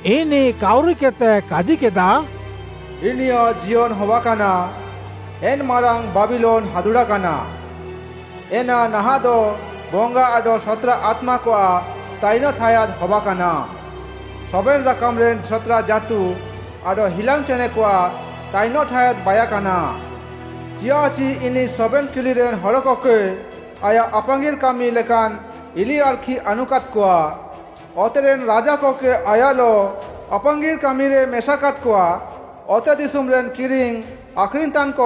ଇନିଃ କାଉରିକେଦ୍‌ତେ କାଜିକେଦା, “ଇନିୟାଃ ଜିୟନ୍‌ ହବାକାନା। ଏନ୍‌ ମାରାଙ୍ଗ୍‌ ବାବିଲୋନ୍‌ ହାଦୁଡ଼ାକାନା। ଏନା ନାହାଃଁଦ ବଙ୍ଗା ଆଡଃ ସତ୍‌ରା ଆତ୍ମାକଆଃ ତାଇନଃ ଠାୟାଦ୍‌ ହବାକାନା। ସବେନ୍‌ ରାକାମ୍‌ରେନ୍‌ ସତ୍‌ରା ଜାଁତୁ ଆଡଃ ହିଲାଙ୍ଗ୍‌ ଚେଣେଁକଆଃ ତାଇନଃ ଠାୟାଦ୍‌ ବାଇୟାକାନା। ଚିୟାଃଚି ଇନିଃ ସବେନ୍‌ କିଲିରେନ୍‌ ହଡ଼କକେ ଆୟାଃ ଆପାଙ୍ଗିର୍‌ କାମି ଲେକାନ୍‌ ଇଲିଆର୍‌ଖି ଆନୁକାଦ୍‌କଆ। ଅତେରେନ୍‌ ରାଜାକକେ ଆୟାଃଲଃ ଆପାଙ୍ଗିର୍‌ କାମିରେ ମେସାକାଦ୍‌କଆ। ଅତେଦିଶୁମ୍‌ରେନ୍‌ କିରିଙ୍ଗ୍‌ ଆଖ୍‌ରିଙ୍ଗ୍‌ତାନ୍‌କ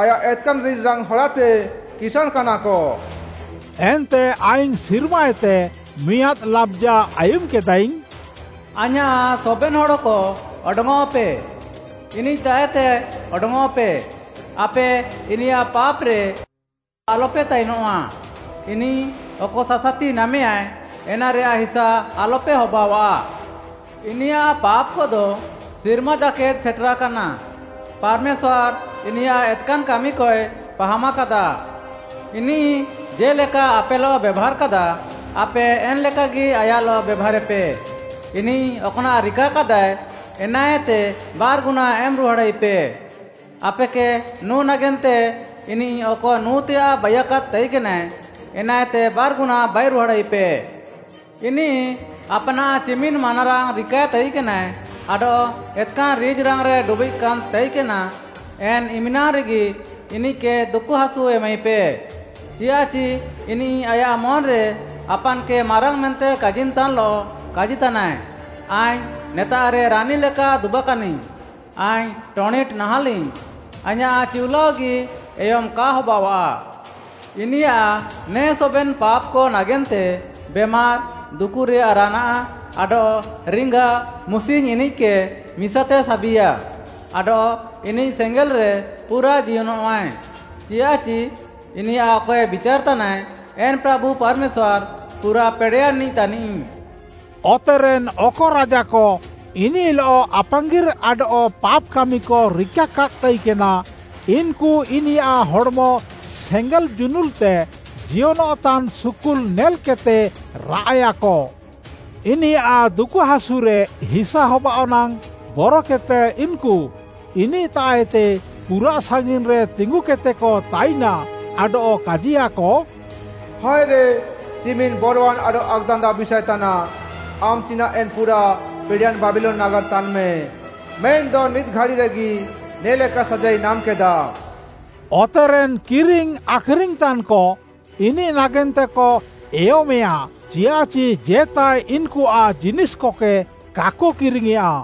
ଆୟାଃ ଏତ୍‌କାନ୍‌ ରିଜ୍‌ରାଙ୍ଗ୍‌ ହରାତେ କିସାଁଣ୍‌କାନାକ।” ଏନ୍ତେ ଆଇଙ୍ଗ୍‌ ସିର୍ମାଏତେ ମିଆଁଦ୍‌ ଲାବ୍‌ଜା ଆୟୁମ୍‌କେଦାଇଙ୍ଗ୍‌, “ଆଇଁୟାଃ ସବେନ୍‌ ହଡ଼କ ଅଡଙ୍ଗ୍‌ଅଃପେ! ଇନିଃତାଃଏତେ ଅଡଙ୍ଗ୍‌ଅଃପେ! ଆପେ ଇନିୟାଃ ପାପ୍‌ରେ ଆଡଃ ଆଲପେ ତାଇନଃଆ। ଇନିଃ ଅକ ସାସାତି ନାମେୟାଁଏ, ଏନାରେୟାଃ ହିସା ଆଲପେ ହବାଅଃଆ। ଇନିୟାଃ ପାପ୍‌କଦ ସିର୍ମା ଜାକେଦ୍ ସେଟେରାକାନା। ପାର୍‌ମେଶ୍ୱାର୍‌ ଇନିୟାଃ ଏତ୍‌କାନ୍‌ କାମିକଏ ପାହାମାକାଦା। ଇନିଃ ଜେ'ଲେକା ଆପେଲଃ ବେଭାର୍‌କାଦା, ଆପେ ଏନ୍‌ଲେକାଗି ଆୟାଃଲଃ ବେଭାରେପେ, ଇନିଃ ଅକ୍‌ନାଃ ରିକାକାଦାଏ, ଏନାଏତେ ବାର୍‌ଗୁନା ଏମ୍‍ ରୁହାଡ଼ାଇପେ। ଆପେକେ ନୁଁ ନାଗେନ୍ତେ ଇନିଃ ଅକ ନୁଁଏତେୟାଃ ବାଇୟାକାଦ୍‌ ତାଇକେନାଏ, ଏନାଏତେ ବାର୍‌ଗୁନା ବାଇରୁହାଡ଼ାଇପେ। ଇନିଃ ଆପାନାଃ ଚିମିନ୍‌ ମାନାରାଙ୍ଗ୍‌ ରିକାଏ ତାଇକେନାଏ ଆଡଃ ଏତ୍‌କାନ୍‌ ରିଜ୍‌ରାଙ୍ଗ୍‌ରେ ଡୁବିଃଗ୍‌କାନ୍‌ ତାଇକେନା, ଏନ୍‌ ଇମ୍‌ନାଙ୍ଗ୍‌ରେଗି ଇନିଃକେ ଦୁକୁହାସୁ ଏମାଇପେ। ଚିଆଃଚି ଇନିଃ ଆୟାଃ ମନ୍‌ରେ ଆପାନ୍‌କେ ମାରାଙ୍ଗ୍‌ ମେନ୍ତେ କାଜିନ୍‌ତାନ୍‌ଲଃ କାଜିତାନାଏ, ‘ଆଇଙ୍ଗ୍‌ ନେତାଃରେ ରାନୀ ଲେକା ଦୁବାକାନାଇଙ୍ଗ୍‌, ଆଇଙ୍ଗ୍‌ ଟଣିଟ୍‌ ନାହାଁଲିଙ୍ଗ୍‌, ଆଇଁୟାଃ ଚିଉଲାଅଗି ଏୟମ୍‌ କା ହବାଅଃଆ।’ ଇନିୟାଃ ନେ ସବେନ୍‌ ପାପ୍‌କ ନାଗେନ୍ତେ ବେମାର୍‌, ଦୁକୁରେୟାଃ ରାନାଃ, ଆଡଃ ରିଙ୍ଗା ମୁସିଙ୍ଗ୍‌ ଇନିଃକେ ମିସାତେ ସାବିଆ। ଆଡଃ ଇନିଃ ସେଙ୍ଗେଲ୍‌ରେ ପୁରା ଜିୟନଃଆଏ। ଚିୟାଃଚି ଇନିୟାଃ ଅକଏ ବିଚାର୍‌ ତାନାଏ, ଏନ୍‌ ପ୍ରାଭୁ ପାର୍‌ମେଶ୍ୱାର୍‌ ପୁରାଃ ପେଡ଼େୟାନ୍‌ନିଃ ତାନିଃ।” ଅତେରେନ୍‌ ଅକ ରାଜାକ ଇନିଃଲଃ ଆପାଙ୍ଗିର୍‌ ଆଡଃ ପାପ୍‌ କାମିକ ରିକାକାଦ୍‌ ତାଇକେନା, ଇନ୍‌କୁ ଇନିୟାଃ ହଡ଼୍‌ମ ସେଙ୍ଗେଲ୍‌ ଜୁନୁଲ୍‌ତେ ଜିୟନଃତାନ୍‌ ସୁକୁଲ୍‌ ନେଲ୍‌କେଦ୍‌ତେ ରାଆଃଏୟାକ। ଇନିୟାଃ ଦୁକୁହାସୁରେ ହିସା ହବାଃଅ ନାଙ୍ଗ୍‌ ବରକେଦ୍‌ତେ ଇନ୍‌କୁ ଇନିଃତାଃଏତେ ପୁରାଃ ସାଙ୍ଗିନ୍‌ରେ ତିଙ୍ଗୁକେଦ୍‌ତେକ ତାଇନା, ଆଡଃ କାଜିୟାକ, “ହାଏରେ ଚିମିନ୍‌ ବରୱାନ୍‌ ଆଡଃ ଆକ୍‌ଦାନ୍ଦାଅ ବିଷାଏ ତାନାଃ! ଆମ୍‌ ଚିନାଃ ଏନ୍‌ ପୁରାଃ ପେଡ଼େୟାନ୍‌ ବାବିଲୋନ୍‌ ନାଗାର୍‌ ତାନ୍‌ମେ! ମେନ୍‌ଦ ମିଦ୍‌ ଘାଡ଼ିରେଗି ନେ'ଲେକା ସାଜାଇ ନାମ୍‌କେଦାମ୍‌।” ଅତେରେନ୍‌ କିରିଙ୍ଗ୍‌ ଆଖ୍‌ରିଙ୍ଗ୍‌ତାନ୍‍କ ଇନିଃ ନାଗେନ୍ତେକ ଏୟମେଁୟା, ଚିୟାଃଚି ଜେତାଏ ଇନ୍‌କୁଆଃ ଜିନିଷ୍‌କକେ କାକ କିରିଙ୍ଗ୍‌ୟେଁଆ।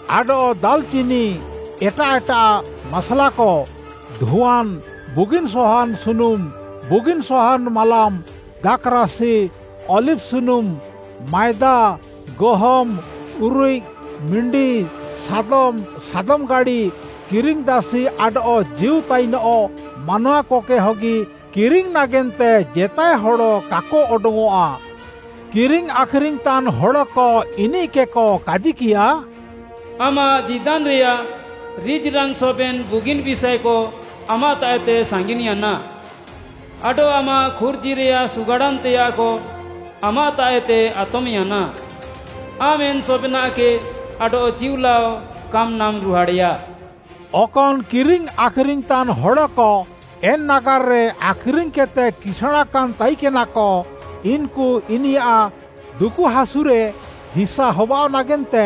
ଆଡଃ ଦାଲ୍‍ଚିନି, ଏଟାଃ ଏଟାଃ ମାସ୍‍ଲାକ, ଧୁଆନ୍‌, ବୁଗିନ୍‌ ସହାନ୍‌ ସୁନୁମ୍‌, ବୁଗିନ୍‌ ସହାନ୍‌ ମାଲାମ୍‌, ଦାଖ୍‌ରାସି, ଅଲିଭ୍‌ ସୁନୁମ୍, ମାଏଦା, ଗହମ୍‌, ଉରିଃକ୍‌, ମିଣ୍ଡି, ସାଦମ୍‌, ସାଦମ୍‌ ଗାଡ଼ି, କିରିଙ୍ଗ୍‌ଦାସି ଆଡଃ ଜୀଉ ତାଇନଃ ମାନୱାକକେ ହଗି କିରିଙ୍ଗ୍‌ ନାଗେନ୍ତେ ଜେତାଏ ହଡ଼ କାକ ଅଡଙ୍ଗ୍‌ଅଃଆ। କିରିଙ୍ଗ୍‌ ଆଖ୍‌ରିଙ୍ଗ୍‌ତାନ୍‍ ହଡ଼କ ଇନିଃକେକ କାଜିକିୟା, “ଆମାଃ ଜୀଦାନ୍‌ରେୟାଃ ରିଜ୍‌ରାଙ୍ଗ୍‌ ସବେନ୍‌ ବୁଗିନ୍‌ ବିଷାଏକ ଆମାଃତାଃଏତେ ସାଙ୍ଗିନ୍‌ୟାନା। ଆଡଃ ଆମାଃ ଖୁର୍ଜିରେୟାଃ ସୁଗାଡ଼ାନ୍‌ତେୟାଃକ ଆମାଃତାଃଏତେ ଆତମ୍‌ୟାନା, ଆମ୍‌ ଏନ୍‌ ସବେନାଃକେ ଆଡଃ ଚିଉଲାଅ କାମ୍ ନାମ୍‌ରୁହାଡ଼େୟା।” ଅକନ୍‌ କିରିଙ୍ଗ୍‌ ଆଖ୍‌ରିଙ୍ଗ୍‌ତାନ୍‌ ହଡ଼କ ଏନ୍‌ ନାଗାର୍‌ରେ ଆଖ୍‌ରିଙ୍ଗ୍‌କେଦ୍‌ତେ କିସାଁଣ୍‌କାନ୍‌ ତାଇକେନାକ, ଇନ୍‌କୁ ଇନିୟାଃ ଦୁକୁହାସୁରେ ହିସା ହବାଃଅ ନାଗେନ୍ତେ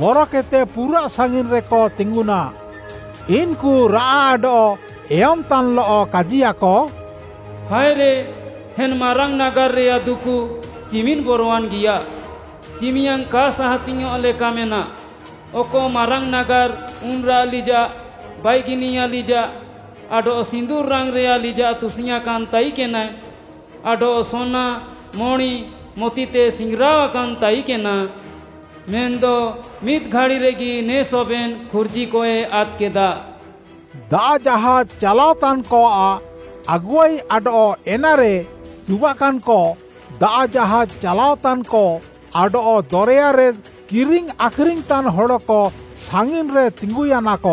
ବରକେଦ୍‌ତେ ପୁରାଃ ସାଙ୍ଗିନ୍‌ରେକ ତିଙ୍ଗୁନା। ଇନ୍‌କୁ ରାଆଃ ଆଡଃ ଏୟମ୍‌ତାନ୍‌ଲଃ କାଜିୟାକ, “ହାଏରେ, ଏନ୍ ମାରାଙ୍ଗ୍‌ ନାଗାର୍‌ରେୟାଃ ଦୁକୁ, ଚିମିନ୍‌ ବରୱାନ୍‌ଗିୟା! ଚିମିୟାଙ୍ଗ୍‌ କା ସାହାତିଙ୍ଗ୍‌ୟଃଁ ଲେକା ମେନାଃ! ଅକ ମାରାଙ୍ଗ୍‌ ନାଗାର୍‌ ଉନ୍‌ରାଃ ଲିଜାଃ, ବାଇଗିନିଆ ଲିଜାଃ ଆଡଃ ସିନ୍ଦୁର୍‌ ରାଙ୍ଗ୍‌ରେୟାଃ ଲିଜାଃ ତୁସିଙ୍ଗ୍‌ୟାଁକାନ୍‌ ତାଇକେନାଏ, ଆଡଃ ସୋନା, ମଣି, ମତିତେ ସିଙ୍ଗ୍‌ରାଅକାନ୍‌ ତାଇକେନା। ମେନ୍‌ଦ ମିଦ୍‌ ଘାଡ଼ିରେଗି ନେ ସବେନ୍‌ ଖୁର୍ଜିକଏ ଆଦ୍‌କେଦା!” ଦାଆଃ ଜାହାଜ୍‌ ଚାଲାଅତାନ୍‌କଆଃ ଆଗୁଆଇ ଆଡଃ ଏନାରେ ଦୁବାକାନ୍‌କ, ଦାଆଃ ଜାହାଜ୍‌ ଚାଲାଅତାନ୍‌କ, ଆଡଃ ଦରେୟାରେ କିରିଙ୍ଗ୍‌ ଆଖ୍‌ରିଙ୍ଗ୍‌ତାନ୍‌ ହଡ଼କ ସାଙ୍ଗିନ୍‌ରେ ତିଙ୍ଗୁୟାନାକ।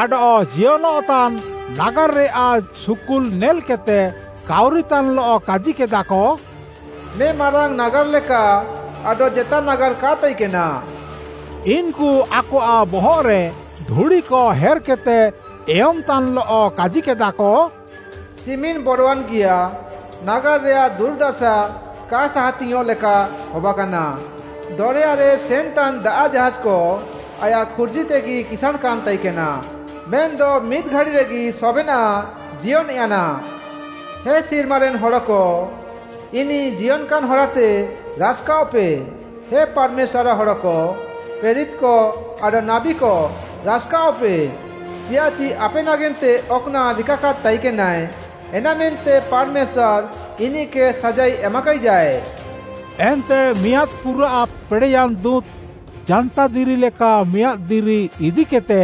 ଆଡଃ ଜିୟନଃତାନ୍‌ ନାଗାର୍‌ରେୟାଃ ସୁକୁଲ୍‌ ନେଲ୍‌କେଦ୍‌ତେ, କାଉରିତାନ୍‌ଲଃ କାଜିକେଦାକ, “ନେ ମାରାଙ୍ଗ୍‌ ନାଗାର୍‌ ଲେକା ଆଡଃ ଜେତା ନାଗାର୍‌ କା ତାଇକେନା।” ଇନ୍‌କୁ ଆକଆଃ ବହଃରେ ଧୁଡ଼ିକ ହେର୍‌କେଦ୍‌ତେ ଏୟମ୍‌ତାନ୍‌ଲଃ କାଜିକେଦାକ, “ଚିମିନ୍‌ ବରୱାନ୍‌ଗିୟା, ନାଗାର୍‌ରେୟାଃ ଦୁର୍‌ଦାସା କା ସାହାତିଙ୍ଗ୍‌ୟଁଃ ଲେକା ହବାକାନା! ଦରେୟାରେ ସେନ୍‌ତାନ୍‌ ଦାଆଃ ଜାହାଜ୍‌କ ଆୟାଃ ଖୁର୍ଜିତେଗି କିସାଁଣ୍‌କାନ୍‌ ତାଇକେନା! ମେନ୍‌ଦ ମିଦ୍‌ ଘାଡ଼ିରେଗି ସବେନାଃ ଜିୟନ୍‌ୟାନା!” ହେ ସିର୍ମାରେନ୍‌ ହଡ଼କ, ଇନିଃ ଜିୟନ୍‌କାନ୍‌ ହରାତେ ରାସ୍‌କାଅଃପେ। ହେ ପାର୍‌ମେଶ୍ୱାର୍‌ଆଃ ହଡ଼କ, ପ୍ରେରିତ୍‌କ ଆଡଃ ନାବୀକ ରାସ୍‌କାଅଃପେ! ଚିଆଃଚି ଆପେ ନାଗେନ୍ତେ ଅକ୍‌ନାଃ ରିକାକାଦ୍‌ ତାଇକେନାଏ, ଏନାମେନ୍ତେ ପାର୍‌ମେଶ୍ୱାର୍‌ ଇନିଃକେ ସାଜାଇ ଏମାକାଇଜାଏ। ଏନ୍ତେ ମିଆଁଦ୍‌ ପୁରାଃ ପେଡ଼େୟାନ୍‌ ଦୁଁତ୍‌, ଜାନ୍ତାଦିରି ଲେକା ମିଆଁଦ୍‌ ଦିରି ଇଦିକେଦ୍‌ତେ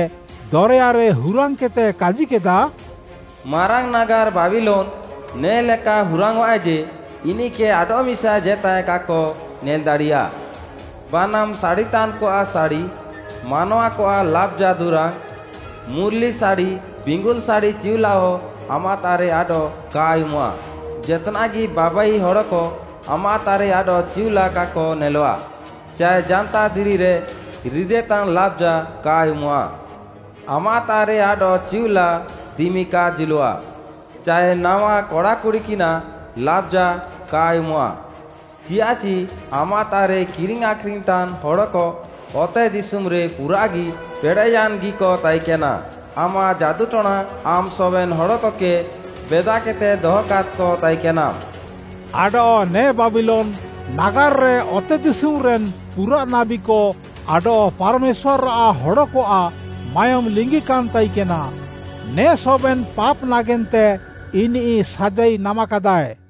ଦରେୟାରେ ହୁରାଙ୍ଗ୍‌କେଦ୍‌ତେ କାଜିକେଦା, “ମାରାଙ୍ଗ୍‌ ନାଗାର୍‌ ବାବିଲୋନ୍‌, ନେ'ଲେକା ହୁରାଙ୍ଗ୍‌ଅଃଆଏ ଯେ, ଇନିଃକେ ଆଡଃମିସା ଜେତାଏ କାକ ନେଲ୍‌ ଦାଡ଼ିୟା। ବାନାମ୍‌ ସାଡ଼ିତାନ୍‌କଆଃ ସାଡ଼ି, ମାନୱାକଆଃ ଲାବ୍‌ଜା ଦୁରାଙ୍ଗ୍‌, ମୁର୍‌ଲି ସାଡ଼ି, ବିଙ୍ଗୁଲ୍‌ ସାଡ଼ି ଚିଉଲାଅ ଆମାଃତାଃରେ ଆଡଃ କା ଆୟୁମଃଆ। ଜେତ୍‌ନାଃଗି ବାବାଇ ହଡ଼କ ଆମାଃତାଃରେ ଆଡଃ ଚିଉଲାଅ କାକ ନେଲଃଆ, ଚାଏ ଜାନ୍ତାଦିରିରେ ରିଦେତାନ୍‌ ଲାବ୍‌ଜା କା ଆୟୁମଃଆ। ଆମାଃତାଃରେ ଆଡଃ ଚିଉଲାଅ ଦିମି କା ଜୁଲଃଆ, ଚାଏ ନାୱା କଡ଼ାକୁଡ଼ିକିନାଃ ଲାବ୍‌ଜା କା ଆୟୁମଃଆ। ଚିଆଃଚି ଆମାଃତାଃରେ କିରିଙ୍ଗ୍‌ ଆଖ୍‌ରିଙ୍ଗ୍‌ତାନ୍‌ ହଡ଼କ ଅତେଦିଶୁମ୍‌ରେ ପୁରାଃଗି ପେଡ଼େୟାନ୍‌ଗିକ ତାଇକେନା, ଆମାଃ ଯାଦୁଟଣାତେ ଆମ୍‌ ସବେନ୍‌ ହଡ଼କକେ ବେଦାକେଦ୍‌ତେ ଦହକାଦ୍‌କ ତାଇକେନାମ୍‌।” ଆଡଃ ନେ ବାବିଲୋନ୍‌ ନାଗାର୍‌ରେ ଅତେଦିଶୁମ୍‌ରେନ୍‌ ପୁରାଃ ନାବୀକ ଆଡଃ ପାର୍‌ମେଶ୍ୱାର୍‌ଆଃ ହଡ଼କଆଃ ମାୟୋମ୍‌ ଲିଙ୍ଗିକାନ୍‌ ତାଇକେନା। ନେ ସବେନ୍‌ ପାପ୍‌ ନାଗେନ୍ତେ ଇନିଃ ସାଜାଇ ନାମାକାଦାଏ।